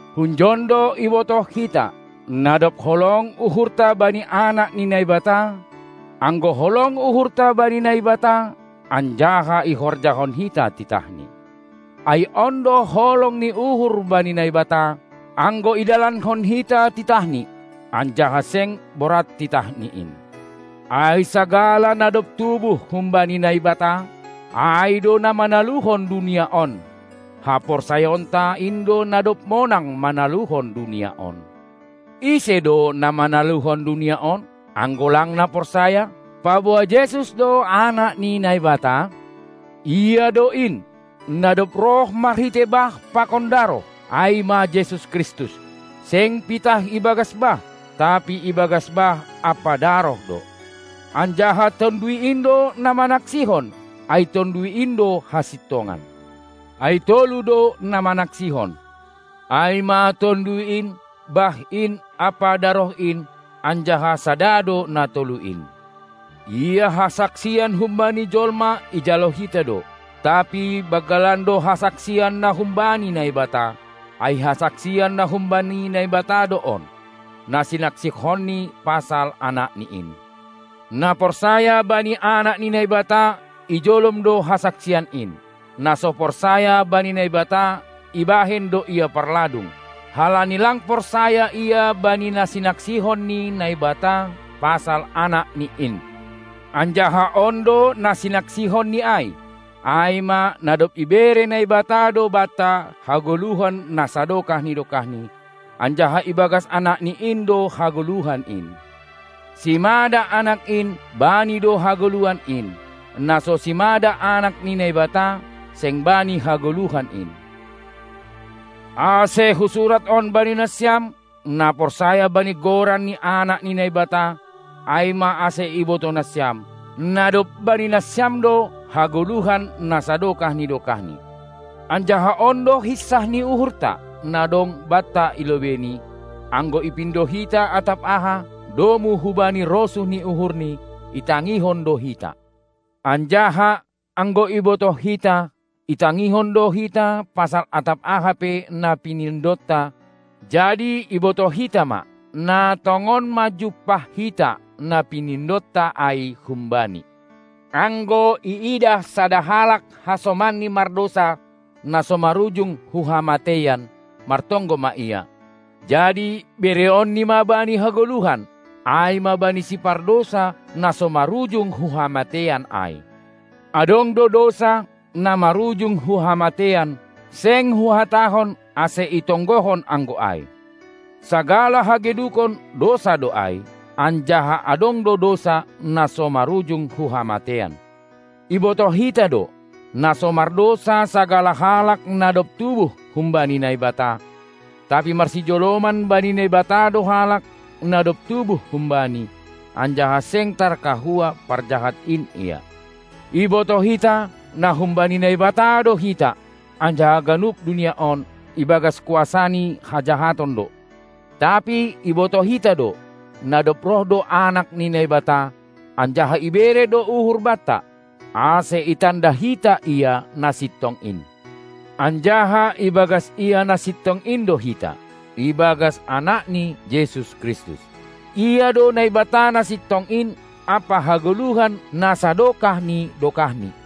Hunjon do ibotoh hita, na dob holong uhurta bani anak ni Naibata, anggo holong uhurta bani Naibata anjaha ihorjahon hita titahNi. Ai on do holong ni uhur bani Naibata, anggo idalankon hita titahNi, anjaha seng borat titahNi in. Ai sagala na dob tubuh humbani Naibata, ai do na manaluhon dunia on. Haporsayaonta, in do na dob monang manaluhon dunia on. Ise do na manaluhon dunia on, anggo lang na porsaya, paboa Jesus do Anak ni Naibata? Ia do in, na dob roh marhitei bah pakon daroh, ai ma Jesus Kristus, seng pitah ibagas bah, tapi ibagas bah ampa daroh do. Anjaha Tonduy in do na manaksihon, ai Tonduy in do hasintongan. Ai tolu do na manaksihon, ai ma Tonduy in, bah in ampa daroh in, anjaha sada do na tolu in. Ia hasaksian humbani jolma ijalo hita do, tapi banggalan do hasaksian na humbani Naibata, ai hasaksian na humbani Naibata do on, na sinaksihonni pasal Anakni in. Na porsaya bani Anak ni Naibata, ijolom do hasaksian in. Na so porsaya bani Naibata, ibahen do Ia parladung, halani lang porsaya ia bani na sinaksihon ni Naibata pasal AnakNi in. Anjaha on do na sinaksihonni ai, ai ma, na dob ibere Naibata do banta hagoluhan na sadokah ni dokahni, anjaha ibagas AnakNi in do hagoluhan in. Simada Anak in, bani do hagoluhan in, na so simada Anak ni Naibata, seng bani hagoluhan in. Ase husurat on bani nasiam, na porsaya bani goran ni Anak ni Naibata, ai ma, ase ibotoh nasiam, na dob bani nasiam do hagoluhan na sadokah ni dokahni. Anjaha on do hinsah ni uhurta, na dong banta i lobeini: Anggo ipindo hita atap aha domu hubani rosuh ni uhurNi, itangihon do hita. Anjaha, anggo ibotoh hita, itangihon do hita pasal atap aha pe na pinindonta, jadi ibotoh hita ma, na tongon ma jumpah hita na pinindonta ai hum-Bani. Anggo, iidah sada halak hasomanni mardousa, na so marujung hu hamateian, martonggo ma ia, jadi bereonNi ma bani hagoluhan, ai ma bani sipardousa, na so marujung hu hamateian ai. Adong do dousa, na marujung hu hamateian, seng huhatahon, ase itonggohon anggo ai. Sagala hagedukon, dousa do ai, anjaha adong do dousa, na so marujung hu hamateian. Ibotoh hita do, na so mardousa sagala halak na dob tubuh humbani Naibata, tapi marsijoloman bani Naibata do halak, na dob tubuh hum-Bani, anjaha seng tarkahua parjahat in ia. Ibotoh hita, na humbani Naibata do hita, anjaha ganup dunia on ibagas kuasa ni hajahaton do. Tapi ibotoh hita do, na dob roh do Anak ni Naibata, anjaha ibere do uhur banta, ase itanda hita Ia na sintong in. Anjaha ibagas Ia na sintong in do hita, ibagas Anakni Jesus Kristus. Ia do Naibata na sintong in ampa hagoluhan na sadokah ni dokahni.